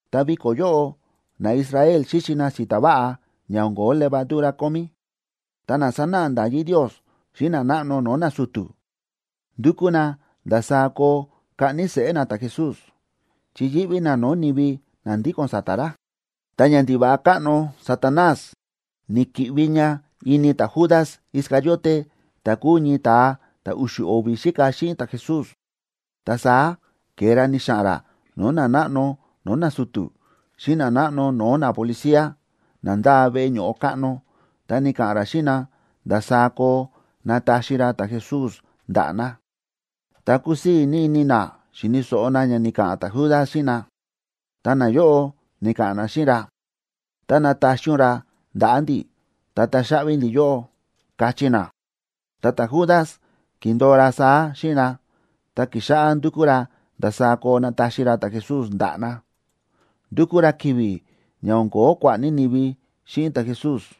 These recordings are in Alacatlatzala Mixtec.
ta viko̱ yóꞌo naIsrael xíxi na si̱ta̱ váꞌa ña o̱n ko̱ó levadura kómí. Ta na sánáꞌa nda̱yí Ndios xíꞌin nanáꞌno no̱o̱ nasu̱tu̱ ndúkú na ndasaá koo kaꞌni seꞌé na ta̱Jesús, chi yíꞌví na no̱o̱ ni̱vi na ndíko̱n sa̱ta̱ ra. Ta ñandiva̱ꞌa káꞌno Satanás ni̱ki̱ꞌvi ña ini ta̱Judas Iscariote ta̱ kúu ñii ta̱a ta̱ u̱xu̱ o̱vi̱ xíka xíꞌin ta̱Jesús. Ta saá ke̱e ra ni̱xa̱ꞌa̱n ra no̱o̱ nanáꞌno no̱o̱ nasu̱tu̱ xíꞌin nanáꞌno no̱o̱ napolicía na ndáa veꞌe ño̱ꞌo káꞌno, ta ni̱ka̱ꞌa̱n ra xíꞌin na ndasaá koo nataxi ra ta̱Jesús ndaꞌa̱ na. Ta ku̱sii̱ ní ini na xi̱ni̱ so̱ꞌo na ña ni̱ka̱ꞌa̱n ta̱Judas xíꞌin na, ta nayóꞌo ni̱ka̱ꞌa̱n na xíꞌin ra: ―Tá nataxi ún ra ndaꞌa̱ ndi̱, ta taxaꞌvi ndi̱ yóꞌó ―káchí na. Ta ta̱Judas ki̱ndo̱o ra saá xíꞌin na, ta ki̱xáꞌá ndukú ra ndasaá koo nataxi ra ta̱Jesús ndaꞌa̱ na. Ndúkú ra ki̱vi̱ ña o̱n ko̱ó kua̱ꞌa̱ ní ni̱vi xíꞌin ta̱Jesús.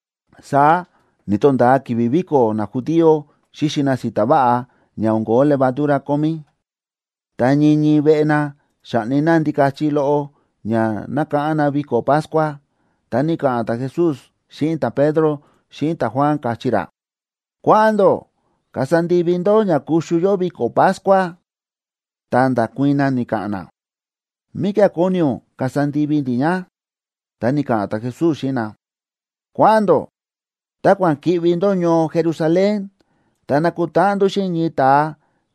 Saá ni̱to̱nda̱a ki̱vi̱ viko̱ najudío xíxi na si̱ta̱ váꞌa ña o̱n ko̱ó levadura kómí, ta ñii ñii veꞌe na xáꞌni na ndikachi loꞌo ña nákáꞌán na viko̱ Pascua. Ta ni̱ka̱ꞌa̱n ta̱Jesús xíꞌin ta̱Pedro xíꞌin ta̱Juan, káchí ra: ―Kua̱ꞌa̱n ndó kasa ndivi ndó ña kuxu yó viko̱ Pascua. Ta nda̱kuii̱n na, ni̱ka̱ꞌa̱n na: ―¿Míkía̱ kóni ún kasa ndivi ndi̱ ña? Ta ni̱ka̱ꞌa̱n ta̱Jesús xíꞌin na: ―Kua̱ꞌa̱n ndó, ta kua̱ꞌa̱n ki̱ꞌvi ndó ñoo Jerusalén, ta nakutáꞌan ndó xíꞌin ñii ta̱a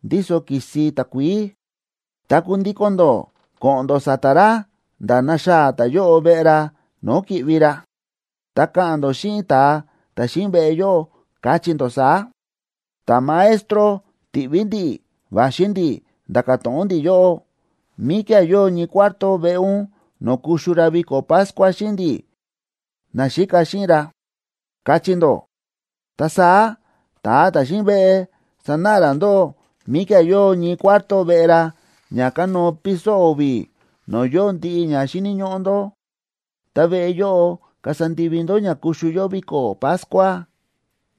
ndíso ki̱si takuií, ta kundíko̱n ndó ko̱ꞌo̱n ndó sa̱ta̱ ra nda̱ naxaa̱ ta̱yóꞌo veꞌe ra no̱o̱ ki̱ꞌvi ra, ta ka̱ꞌa̱n ndó xíꞌin ta̱a ta̱ xíꞌin veꞌe yóꞌo, káchí ndó saá: “Ta̱Maestro ti̱ꞌví ndi̱ꞌi̱ va̱xi ndi̱ nda̱ka̱ to̱ꞌon ndi̱ yóꞌó: ¿Míkía̱ yóo ñii cuarto veꞌe ún no̱o̱ kuxu ra viko̱ Pascua xíꞌin ndi̱, naxíka xíꞌin ra?”, kachí ndó. Ta saá ta̱a ta̱ xíꞌin veꞌe sanáꞌa ra ndóꞌó míkía̱ yóo ñii cuarto veꞌe ra ña kánóo piso o̱vi̱, no̱o̱ yóo ndiꞌi ña xíni̱ ñóꞌó ndó. Ta veꞌe yóꞌo kasa ndivi ndó ña kuxu yó viko̱ Pascua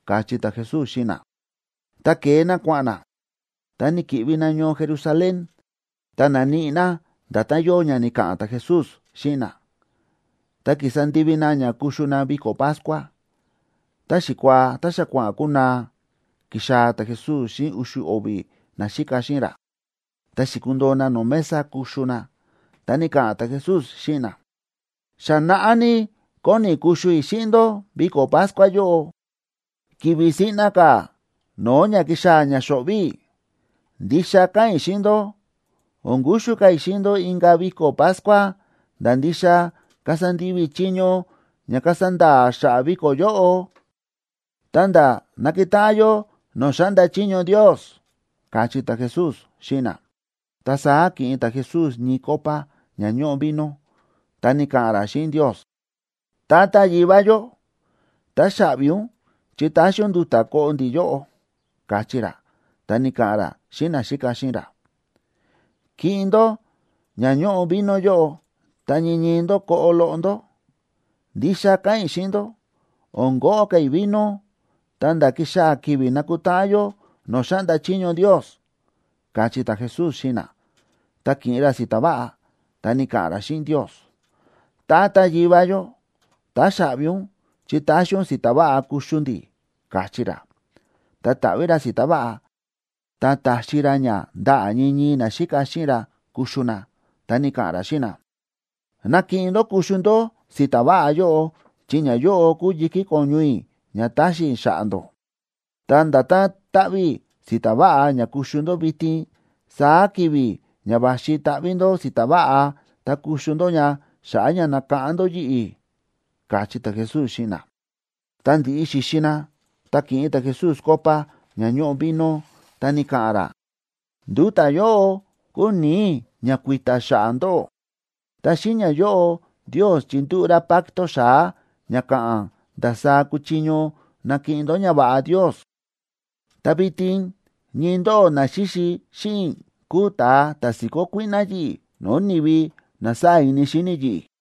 ―káchí ta̱Jesús xíꞌin na. Ta ke̱e na kua̱ꞌa̱n na, ta ni̱ki̱ꞌvi na ñoo Jerusalén, ta na̱níꞌi na nda̱tán yóo ña ni̱ka̱ꞌa̱n ta̱Jesús xíꞌin na, ta ki̱sa ndivi na ña kuxu na viko̱ Pascua. Ta xikuaa ta xa kua̱ꞌa̱n kunaa, ki̱xaa̱ ta̱Jesús xíꞌin u̱xu̱ o̱vi̱ naxíka xíꞌin ra, ta xi̱kundoo na no̱o̱ mesa kuxu na. Ta ni̱ka̱ꞌa̱n ta̱Jesús xíꞌin na: ―Xa naꞌá ní kóni i̱ kuxu i̱ xíꞌin ndó viko̱ Pascua yóꞌo, ki̱vi̱ siꞌna ka̱ no̱o̱ ña kixaa̱ ña xo̱ꞌvi̱ i̱. Ndixa káꞌa̱n i̱ xíꞌin ndó, o̱n kuxu ka̱ i̱ xíꞌin ndó inka̱ viko̱ Pascua nda̱ ndixa kasa ndivi i̱ chiño ña kasa nda̱a̱ xa̱ꞌa̱ viko̱ yóꞌo, ta̱nda̱ nakutáꞌan yó no̱o̱ xáꞌnda chiño Ndios ―káchí ta̱Jesús xíꞌin na. Ta saá ki̱ꞌin ta̱Jesús ñii copa ña ñóꞌo vino, ta ni̱ka̱ꞌa̱n ra xíꞌin Ndios: ―Tata Yivá yó, táxaꞌvi ún chi ta̱xi ún nduta̱ koꞌo ndi̱ yóꞌo ―káchí ra, ta ni̱ka̱ꞌa̱n ra xíꞌin naxíka xíꞌin ra: ―Kiꞌin ndó ña ñóꞌo vino yóꞌo, ta ñii ñii ndó koꞌo loꞌo ndó. Ndixa káꞌa̱n i̱ xíꞌin ndó, o̱n koꞌo ka̱ i̱ vino ta̱nda̱ ki̱xaa̱ ki̱vi̱ nakutáꞌan yó no̱o̱ xáꞌnda chiño Ndios ―káchí ta̱Jesús xíꞌin na. Ta ki̱ꞌin ra si̱ta̱ váꞌa, ta ni̱ka̱ꞌa̱n ra xíꞌin Ndios: ―Tata Yivá yó, táxaꞌvi ún chi ta̱xi ún si̱ta̱ váꞌa kuxu ndi̱ ―káchí ra. Ta ta̱ꞌví ra si̱ta̱ váꞌa, ta ta̱xi ra ña ndaꞌa̱ ñii ñii naxíka xíꞌin ra kuxu na. Ta ni̱ka̱ꞌa̱n ra xíꞌin na: ―Nakiꞌin ndó kuxu ndó si̱ta̱ váꞌa yóꞌo, chi ñayóꞌo kúu yi̱kí ko̱ñu i̱ ña taxi i̱ xa̱ꞌa̱ ndó. Ta nda̱tán ta̱ꞌví i̱ si̱ta̱ váꞌa ña kuxu ndó vitin, saá ki̱vi̱ ña va̱xi taꞌví ndó si̱ta̱ váꞌa ta kuxu ndó ña xa̱ꞌa̱ ña nakáꞌán ndó yi̱ꞌi̱ ―káchí ta̱Jesús xíꞌin na. Ta ndi̱ꞌi xi̱xi na, ta ki̱ꞌin ta̱Jesús copa ña ñóꞌo vino, ta ni̱ka̱ꞌa̱n ra: ―Nduta̱ yóꞌo kúu ni̱i̱ i̱ ña kui̱ta̱ xa̱ꞌa̱ ndóꞌó. Ta xíꞌin ñayóꞌo Ndios chindúꞌu̱ ra pacto xa̱á ña ka̱ꞌa̱n ndasaá kuchiño nakiꞌin ndó ñava̱ꞌa Ndios. ’Ta vitin ñii ndóꞌó na xíxi xíꞌin i̱ kúu ta̱a ta̱ si̱kó kuíꞌná yi̱ꞌi̱ no̱o̱ ni̱vi na sáa̱ ini xíni yi̱ꞌi̱.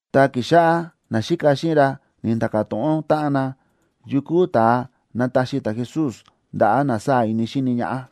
Ta ki̱xáꞌá naxíka xíꞌin ra ni̱nda̱ka̱ to̱ꞌon táꞌan na yukú ta̱a nataxi ta̱Jesús ndaꞌa̱ na sáa̱ ini xíni ñaꞌá.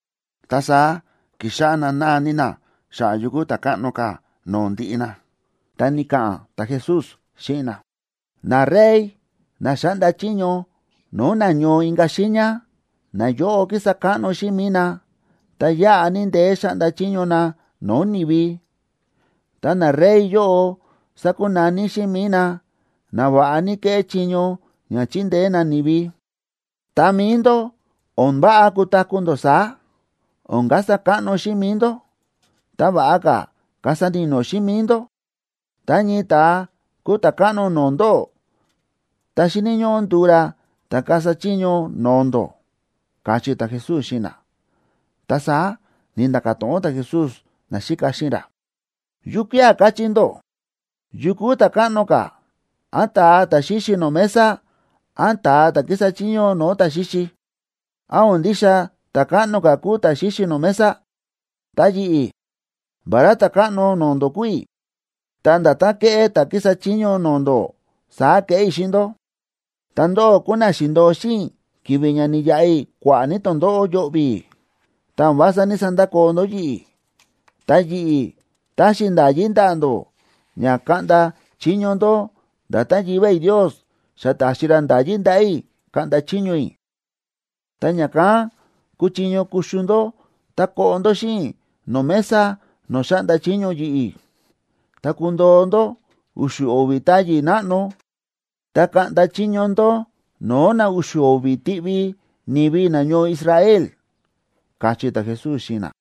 Ta saá ki̱xáꞌá na náa ní na xa̱ꞌa̱ yu kúu ta̱ káꞌno ka̱ no̱o̱ ndiꞌi na. Ta ni̱ka̱ꞌa̱n ta̱Jesús xíꞌin na: ―Narey na xáꞌnda chiño no̱o̱ na ñoo inka̱ xiiña, nayóꞌo kísa káꞌno xíꞌin mi̱i na, ta yáꞌa ní ndeé xáꞌnda chiño na no̱o̱ ni̱vi. Ta narey yóꞌo sákunaní xíꞌin mi̱i na: Na va̱ꞌa ní kéꞌé chiño ña chindeé na ni̱vi. Ta mi̱i ndó, o̱n váꞌa kutaku̱ ndó saá. O̱n kasa káꞌno xíꞌin mi̱i ndó, ta va̱ꞌa ka̱ kasa ni̱no̱ xíꞌin mi̱i ndó. Tá ñii ta̱a kúu ta̱ káꞌno no̱o̱ ndóꞌó, ta xíni̱ ñóꞌó nduu ra ta̱ kasa chiño no̱o̱ ndó ―káchí ta̱Jesús xíꞌin na. Ta saá ni̱nda̱ka̱ to̱ꞌon ta̱Jesús naxíka xíꞌin ra: ―¿Yukía̱ káchí ndó? ¿Yu kúu ta̱káꞌno ka̱, án ta̱a ta̱ xíxi no̱o̱ mesa, án ta̱a ta̱ kísa chiño no̱o̱ ta̱ xíxi? ¿Án o̱n ndixa ta̱káꞌno ka̱ kúu ta̱ xíxi no̱o̱ mesa? Ta yi̱ꞌi̱, vará Ta̱káꞌno no̱o̱ ndó kúu i̱, ta nda̱tán kéꞌé ta̱ kísa chiño no̱o̱ ndó, saá kéꞌé i̱ xíꞌin ndó. ’Ta ndóꞌó kúu na xi̱ndo̱o xíꞌin i̱ ki̱vi̱ ña ni̱yaꞌa i̱ kua̱ꞌa̱ ní tondóꞌó yo̱ꞌvi̱, ta o̱n vása ní‑sandakoo ndó yi̱ꞌi̱. Ta yi̱ꞌi̱ taxi i̱ nda̱yí ndaꞌa̱ ndó ña kaꞌnda chiño ndó, nda̱tán Yivá i̱ Ndios xa ta̱xi ra nda̱yí ndaꞌa̱ i̱ kaꞌnda chiño i̱. Ta ña̱kán kuchiño kuxu ndó ta koꞌo ndó xíꞌin i̱ no̱o̱ mesa no̱o̱ xáꞌnda chiño yi̱ꞌi̱, ta kundoo ndó u̱xu̱ o̱vi̱ táyi̱ náꞌno, ta kaꞌnda chiño ndó no̱o̱ na u̱xu̱ o̱vi̱ tiꞌvi ni̱vi nañoo Israel ―káchí ta̱Jesús xíꞌin na.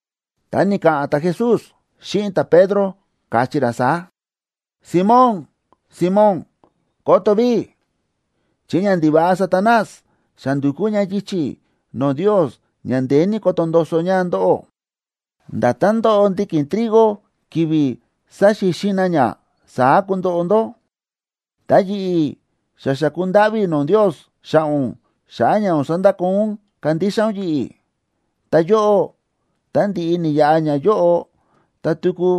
Ta ni̱ka̱ꞌa̱n ta̱Jesús xíꞌin ta̱Pedro, káchí ra saá: ―Simón, Simón, ¡koto ví!, chi ñandiva̱ꞌa Satanás xa ndu̱kú ña yichi̱ no̱o̱ Ndios ña ndeé ní koto ndoso ña ndóꞌó. Nda̱tán ndóꞌo ndiki̱n trigo ki̱vi̱ sáxixin na ña, saá kundoꞌo ndó. Ta yi̱ꞌi̱, xa xa̱ku ndáꞌví i̱ no̱o̱ Ndios xa̱ꞌa̱ ún xa̱ꞌa̱ ña o̱n sandakoo ún kándixa ún yi̱ꞌi̱. Ta yóꞌó, ta ndi̱ꞌi ni̱yaꞌa ñayóꞌo ta tuku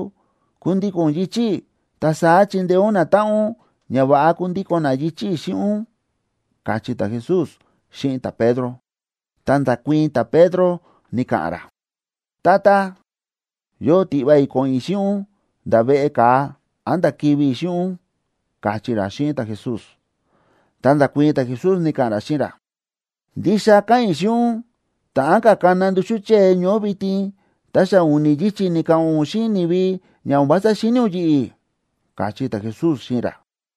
kundíko̱n ún yichi̱ i̱, ta saá chindeé ún natáꞌan ún ña va̱ꞌa kundíko̱n na yichi̱ i̱ xíꞌin ún ―káchí ta̱Jesús xíꞌin ta̱Pedro. Ta nda̱kuii̱n ta̱Pedro, ni̱ka̱ꞌa̱n ra: ―Tata, yóo tiꞌva i̱ ko̱ꞌo̱n i̱ xíꞌin ún nda̱ veꞌe ka̱a, án nda̱ kivi̱ i̱ xíꞌin ún ―káchí ra xíꞌin ta̱Jesús. Ta nda̱kuii̱n ta̱Jesús, ni̱ka̱ꞌa̱n ra xíꞌin ra: ―Ndixa káꞌa̱n i̱ xíꞌin ún, ta̱ꞌán ka̱ kana nduxú chée ñoó vitin, ta xa u̱ni̱ yichi̱ ni̱ka̱ꞌa̱n ún xíꞌin ni̱vi ña o̱n vása xíni̱ ún yi̱ꞌi̱ ―káchí ta̱Jesús xíꞌin ra.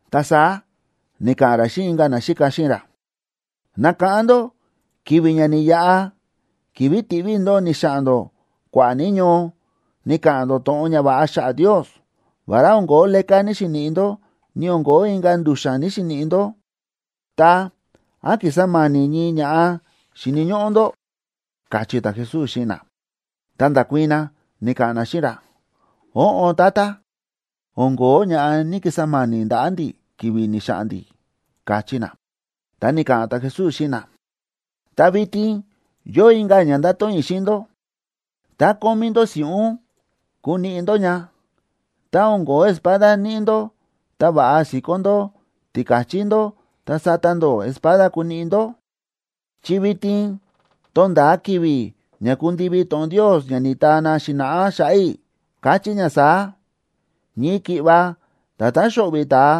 Ta saá ni̱ka̱ꞌa̱n ra xíꞌin inka̱ naxíka xíꞌin ra: ―Nákáꞌán ndó ki̱vi̱ ña ni̱yaꞌa, ki̱vi̱ ti̱ꞌví i̱ ndóꞌó ni̱xa̱ꞌa̱n ndó kua̱ꞌa̱ ní ñoo ni̱ka̱ꞌa̱n ndó to̱ꞌon ñava̱ꞌa xa̱ꞌa̱ Ndios. Vará o̱n ko̱ó leká ni̱‑xiniꞌi ndó, ni o̱n ko̱ó inka̱ ndu̱xa̱n ni̱‑xiniꞌi ndó, ta, ¿án ki̱sa ma̱ni̱ ñii ña̱ꞌa xíni̱ ñóꞌó ndó? ―káchí ta̱Jesús xíꞌin na. Ta nda̱kuii̱n na, ni̱ka̱ꞌa̱n na xíꞌin ra: ―Óꞌon Tata, o̱n ko̱ó ña̱ꞌa ni̱‑kisa ma̱ni̱ ndaꞌa̱ ndi̱ ki̱vi̱ ni̱xa̱ꞌa̱n ndi̱ ―káchí na. Ta ni̱ka̱ꞌa̱n ta̱Jesús xíꞌin na: ―Ta vitin yóo inka̱ ña ndáto̱ꞌon i̱ xíꞌin ndó: Tá kómí ndó si̱ꞌún, kuniꞌi ndó ña. Tá o̱n ko̱ó espada níꞌi ndó, ta va̱ꞌa si̱kó ndó tika̱chí ndó ta sata ndó espada kuniꞌi ndó. Chi vitin tónda̱a ki̱vi̱ ña kundivi to̱ꞌon Ndios ña ni̱taa na xi̱na̱ꞌá xa̱ꞌa̱ i̱, káchí ña saá: “Ñii ki̱ꞌva nda̱tán xóꞌvi̱ ta̱a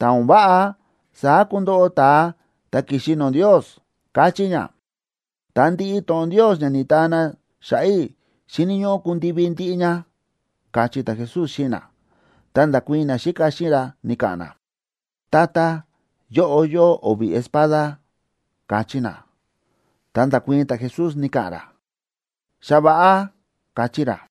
ta̱ o̱n váꞌa, saá kundoꞌo ta̱a ta̱ ki̱xi no̱o̱ Ndios”, káchí ña. Ta ndiꞌi to̱ꞌon Ndios ña ni̱taa na xa̱ꞌa̱ i̱ xíni̱ ñóꞌó kundivi ndiꞌi ña ―káchí ta̱Jesús xíꞌin na. Ta nda̱kuii̱n naxíka xíꞌin ra, ni̱ka̱ꞌa̱n na: ―Tata, yóꞌo yóo o̱vi̱ espada ―káchí na. Ta nda̱kuii̱n ta̱Jesús, ni̱ka̱ꞌa̱n ra: ―Xa va̱ꞌa ―káchí ra.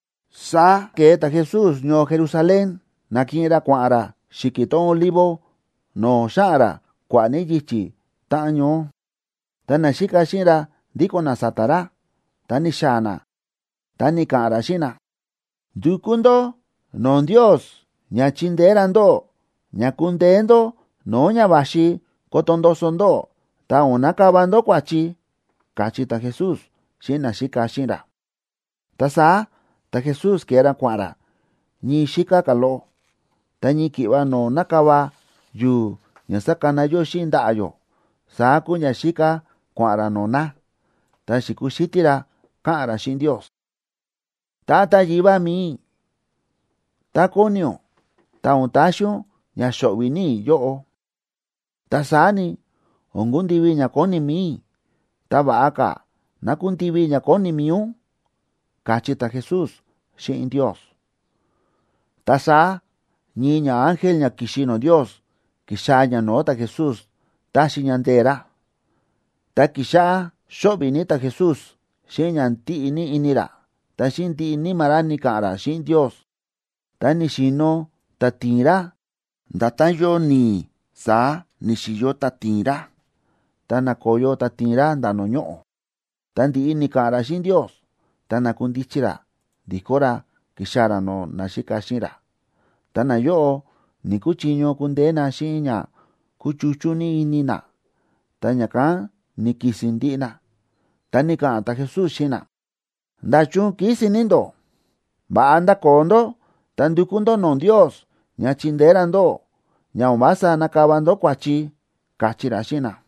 Saá ke̱e ta̱Jesús ñoo Jerusalén, na̱kiꞌin ra kua̱ꞌa̱n ra xi̱ki̱ tón Olivo, no̱o̱ xáꞌa̱n ra kua̱ꞌa̱ ní yichi̱ táꞌan ñoó. Ta naxíka xíꞌin ra ndíko̱n na sa̱ta̱ ra. Ta ni̱xaa̱ na, ta ni̱ka̱ꞌa̱n ra xíꞌin na: ―Ndukú ndó no̱o̱ Ndios ña chindeé ra ndóꞌó ña kundeé ndó no̱o̱ ña va̱xi koto ndoso ndóꞌó, ta o̱n nakava ndó kua̱chi ―káchí ta̱Jesús xíꞌin naxíka xíꞌin ra. Ta saá ta̱Jesús ke̱e ra kua̱ꞌa̱n ra ñii xíká ka̱ loꞌo, ta ñii ki̱ꞌva no̱o̱ nakava yu̱u̱ ña sákana yó xíꞌin ndaꞌa̱ yó, saá kúu ña xíká kua̱ꞌa̱n ra no̱o̱ na, ta xi̱kuxítí ra káꞌa̱n ra xíꞌin Ndios: ―Tata Yivá mi̱i i̱, tá kóni ún, ta o̱n taxi ún ña xo̱ꞌvi̱ ní i̱ yóꞌo. Ta saá ni, o̱n kundivi ña kóni mi̱i i̱, ta va̱ꞌa ka̱ ná kundivi ña kóni mi̱i ún ―káchí ta̱Jesús xíꞌin Ndios. Ta saá ñii ñaángel ña ki̱xi no̱o̱ Ndios, ki̱xaa̱ ña no̱o̱ ta̱Jesús taxi ña ndee̱ ra. Ta ki̱xáꞌá xóꞌvi̱ ní ta̱Jesús xíꞌin ña ndíꞌi ní ini ra, ta xíꞌin ndiꞌi níma̱ ra ni̱ka̱ꞌa̱n ra xíꞌin Ndios, ta ni̱xi̱no̱ táti̱i̱n ra. Nda̱tán yóo ni̱i̱, saá ni̱xi̱yo táti̱i̱n ra, ta na̱koyo táti̱i̱n ra nda̱ no̱o̱ ñoꞌo̱. Ta ndi̱ꞌi ni̱ka̱ꞌa̱n ra xíꞌin Ndios, ta na̱kundichi ra ndi̱kó ra ki̱xaa̱ ra no̱o̱ naxíka xíꞌin ra. Ta nayóꞌo ni̱‑kuchiño kundeé na xíꞌin ña kúchuchú ní ini na, ta ña̱kán ni̱ki̱si̱n ndiꞌi na. Ta ni̱ka̱ꞌa̱n ta̱Jesús xíꞌin na: ―¿Nda̱chun kísi̱n ní ndó? Va̱ꞌa ndakoo ndó, ta ndukú ndó no̱o̱ Ndios ña chindeé ra ndóꞌó ña o̱n vása nakava ndó kua̱chi ―káchí ra xíꞌin na.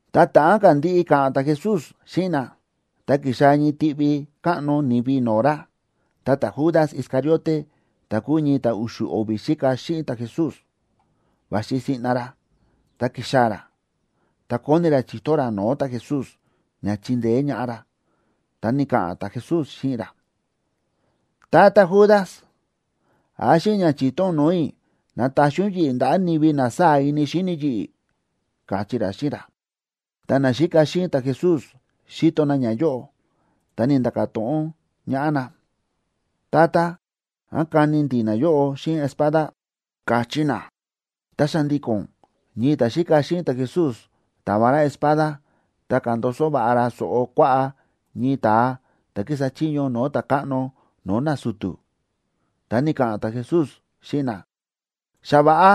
Ta ta̱ꞌán ka̱ ndiꞌi ka̱ꞌa̱n ta̱Jesús xíꞌin na, ta ki̱xaa̱ ñii tiꞌvi káꞌno ni̱vi no̱o̱ ra. Ta ta̱Judas Iscariote ta̱ kúu ñii ta̱ u̱xu̱ o̱vi̱ xíka xíꞌin ta̱Jesús, va̱xi siꞌna ra, ta ki̱xaa̱ ra, ta kóni ra chi̱to ra no̱o̱ ta̱Jesús ña chindeé ñaꞌá ra. Ta ni̱ka̱ꞌa̱n ta̱Jesús xíꞌin ra: ―Tata Judas, ¿án xíꞌin ña chi̱to ún no̱o̱ i̱, nataxi ún yi̱ꞌi̱ ndaꞌa̱ ni̱vi na sáa̱ ini xíni yi̱ꞌi̱? ―káchí ra xíꞌin ra. Tá naxíka xíꞌin ta̱Jesús xi̱to na ñayóꞌo, ta ni̱nda̱ka̱ to̱ꞌon ñaꞌá na: ―Tata, ¿án kani ndi̱ nayóꞌo xíꞌin espada? ―káchí na. Ta xa̱ndi̱ko̱n ñii ta̱xíka xíꞌin ta̱Jesús ta̱va ra espada, ta ka̱ndoso va̱ꞌa ra so̱ꞌo kuaꞌá ñii ta̱a ta̱ kísa chiño no̱o̱ ta̱káꞌno no̱o̱ nasu̱tu̱. Ta ni̱ka̱ꞌa̱n ta̱Jesús xíꞌin na: ―Xa va̱ꞌa,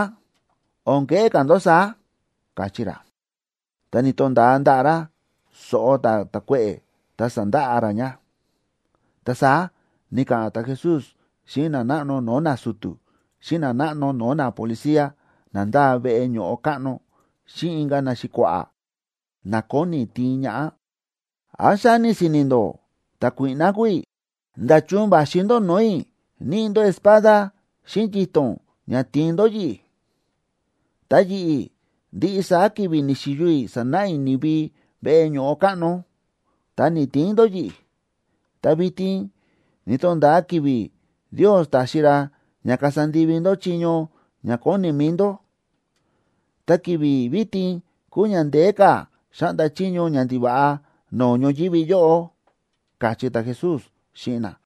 o̱n keꞌé ka̱ ndó saá ―káchí ra. Ta ni̱to̱nda̱a ndaꞌa̱ ra so̱ꞌo ta̱a ta̱kuéꞌe̱, ta sa̱ndaꞌa ra ña. Ta saá ni̱ka̱ꞌa̱n ta̱Jesús xíꞌin nanáꞌno no̱o̱ nasu̱tu̱, xíꞌin nanáꞌno no̱o̱ napolicía na ndáa veꞌe ño̱ꞌo káꞌno, xíꞌin inka̱ naxi̱kua̱ꞌa̱, na kóni tiin ñaꞌá: ―¿Án xáni si̱ni̱ ndó ta̱kuíꞌná kúu i̱? ¿Nda̱chun va̱xi ndó no̱o̱ i̱ níꞌi ndó espada xíꞌin yito̱n ña tiin ndó yi̱ꞌi̱? Ta yi̱ꞌi̱, ndiꞌi saá ki̱vi̱ ni̱xi̱yo i̱ sánáꞌa i̱ ni̱vi veꞌe ño̱ꞌo káꞌno, ta ni̱‑tiin ndó yi̱ꞌi̱. Ta vitin ni̱to̱nda̱a ki̱vi̱ Ndios taxi ra ña kasa ndivi ndó chiño ña kóni mi̱i ndó, ta ki̱vi̱ vitin kúu ña ndeé ka̱ xáꞌnda chiño ñandiva̱ꞌa no̱o̱ ñoyívi yóꞌo ―káchí ta̱Jesús xíꞌin na.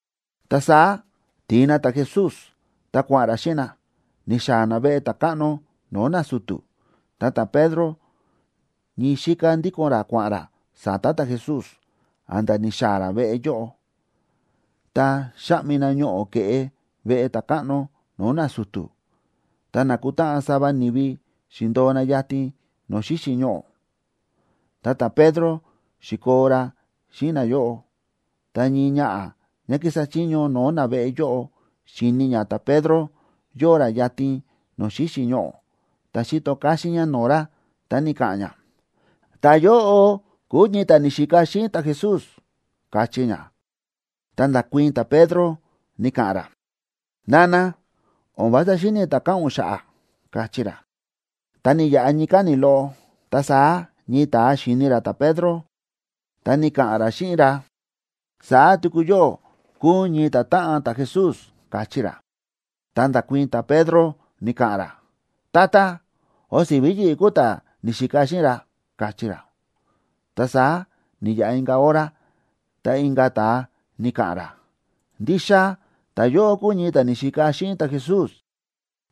Ta saá ti̱in na ta̱Jesús, ta kua̱ꞌa̱n ra xíꞌin na, ni̱xaa̱ na veꞌe ta̱káꞌno no̱o̱ nasu̱tu̱. Ta ta̱Pedro ñii xíká ndíko̱n ra kua̱ꞌa̱n ra sa̱ta̱ ta̱Jesús a̱nda̱ ni̱xaa̱ ra veꞌe yóꞌo. Ta xa̱ꞌmi na ñoꞌo̱ ke̱ꞌe veꞌe ta̱káꞌno no̱o̱ nasu̱tu̱, ta na̱kutáꞌan sava ni̱vi xi̱ndo̱o na yatin no̱o̱ xíxi̱ ñoꞌo̱. Ta ta̱Pedro xi̱koo ra xíꞌin nayóꞌo. Ta ñii ñaꞌa̱ ñá kísa chiño no̱o̱ naveꞌe yóꞌo, xi̱ni̱ ñá ta̱Pedro yóo ra yatin no̱o̱ xíxi̱ ñoꞌo̱, ta xi̱to káxín ñá no̱o̱ ra, ta ni̱ka̱ꞌa̱n ñá: ―Ta̱yóꞌo kúu ñii ta̱ ni̱xika xíꞌin ta̱Jesús ―káchí ñá. Ta nda̱kuii̱n ta̱Pedro, ni̱ka̱ꞌa̱n ra: ―Nana, o̱n vása xíni̱ i̱ ta̱ káꞌa̱n ún xa̱ꞌa̱ ―káchí ra. Ta ni̱yaꞌa ñii káni̱ loꞌo, ta saá ñii ta̱a xi̱ni̱ ra ta̱Pedro, ta ni̱ka̱ꞌa̱n ra xíꞌin ra: ―Saá tuku yóꞌó kúu ún ñii ta̱táꞌan ta̱Jesús ―káchí ra. Ta nda̱kuii̱n ta̱Pedro, ni̱ka̱ꞌa̱n ra: ―Tata, o̱n si̱ví yi̱ꞌi̱ kúu ta̱ ni̱xika xíꞌin ra ―káchí ra. Ta saá ni̱yaꞌa inka̱ hora, ta inka̱ ta̱a ni̱ka̱ꞌa̱n ra: ―Ndixa ta̱yóꞌo kúu ñii ta̱ ni̱xika xíꞌin ta̱Jesús,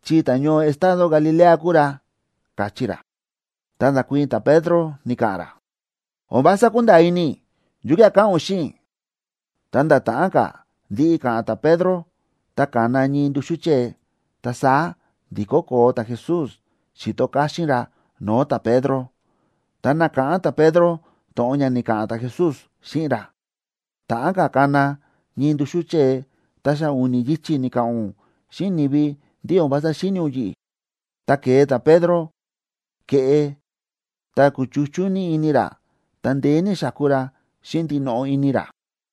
chi ta̱ñoo estado Galilea kúu ra ―káchí ra. Ta nda̱kuii̱n ta̱Pedro, ni̱ka̱ꞌa̱n ra: ―O̱n vása kúnda̱a̱ ini i̱ yukía̱ káꞌa̱n ún xíꞌin i̱. Ta nda̱ ta̱ꞌán ka̱ ndiꞌi ka̱ꞌa̱n ta̱Pedro, ta ka̱na ñii nduxú chée. Ta saá ndi̱kó koo ta̱Jesús xi̱to káxín ra no̱o̱ ta̱Pedro. Ta na̱káꞌán ta̱Pedro to̱ꞌon ña ni̱ka̱ꞌa̱n ta̱Jesús xíꞌin ra: “Ta̱ꞌán ka̱ kana ñii nduxú chée ta xa u̱ni̱ yichi̱ ni̱ka̱ꞌa̱n ún xíꞌin ni̱vi ndí o̱n vása xíni̱ ún yi̱ꞌi̱.” Ta ke̱e ta̱Pedro ke̱ꞌe, ta kúchuchú ní ini ra, ta ndeé ní xáku ra xíꞌin ndinoꞌo ini ra.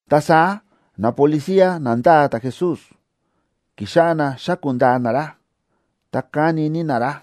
Ta saá napolicía na ndáa ta̱Jesús, ki̱xáꞌá na xáku̱ ndaa na ra, ta káni ní na ra.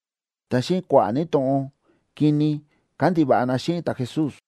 Ta xíꞌin kua̱ꞌa̱ ní to̱ꞌon kini kándiva̱ꞌa na xíꞌin ta̱Jesús.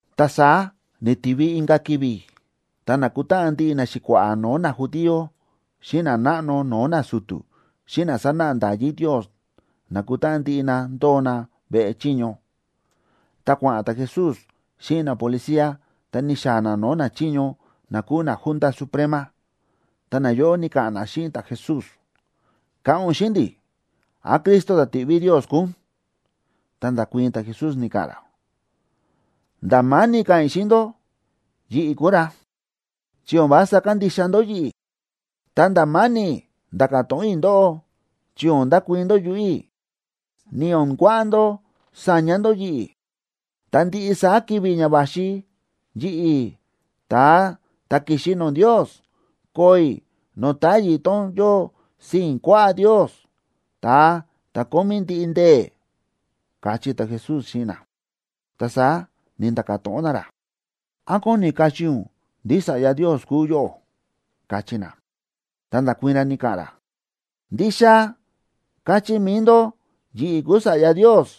Ta saá ni̱tivi inka̱ ki̱vi̱, ta na̱kutáꞌan ndiꞌi naxi̱kua̱ꞌa̱ no̱o̱ najudío, xíꞌin nanáꞌno no̱o̱ nasu̱tu̱, xíꞌin na sánáꞌa nda̱yí Ndios, na̱kutáꞌan ndiꞌi na ndóo na veꞌe chiño. Ta kua̱ꞌa̱n ta̱Jesús xíꞌin napolicía, ta ni̱xaa̱ na no̱o̱ nachiño na kúu naJunta Suprema. Ta nayóꞌo ni̱ka̱ꞌa̱n na xíꞌin ta̱Jesús: ―Ka̱ꞌa̱n ún xíꞌin ndi̱, ¿án Cristo ta̱ ti̱ꞌví Ndios kúu ún? Ta nda̱kuii̱n ta̱Jesús, ni̱ka̱ꞌa̱n ra: ―Nda̱ ma̱ni̱ ka̱ꞌa̱n i̱ xíꞌin ndó yi̱ꞌi̱ kúu ra, chi o̱n vása kandixa ndó yi̱ꞌi̱. Ta nda̱ ma̱ni̱ nda̱ka̱ to̱ꞌon i̱ ndóꞌó, chi o̱n ndakuii̱n ndó yuꞌu̱ i̱, ni o̱n kuaꞌa ndó saña ndó yi̱ꞌi̱. Ta ndiꞌi saá ki̱vi̱ ña va̱xi, yi̱ꞌi̱, ta̱a ta̱ ki̱xi no̱o̱ Ndios, koo i̱ no̱o̱ táyi̱ tón yóo sii̱n kuaꞌá Ndios, ta̱a ta̱ kómí ndiꞌi ndee̱ ―káchí ta̱Jesús xíꞌin na. Ta saá ni̱nda̱ka̱ to̱ꞌon na ra: ―¿Án kóni kachí ún ndí Sa̱ꞌya Ndios kúu yóꞌó? ―káchí na. Ta nda̱kuii̱n ra, ni̱ka̱ꞌa̱n ra: ―Ndixa káchí mi̱i ndó, yi̱ꞌi̱ kúu Sa̱ꞌya Ndios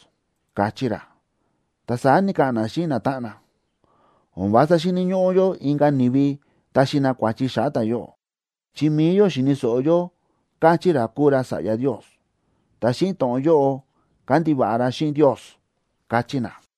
―káchí ra. Ta saá ni̱ka̱ꞌa̱n na xíꞌin natáꞌan na: ―O̱n vása xíni̱ ñóꞌó yó inka̱ ni̱vi taxi na kua̱chi xa̱ꞌa̱ ta̱yóꞌo, chi mi̱i yó xi̱ni̱ so̱ꞌo yó káchí ra kúu ra Sa̱ꞌya Ndios, ta xíꞌin to̱ꞌon yóꞌo kándiva̱ꞌa ra xíꞌin Ndios ―káchí na.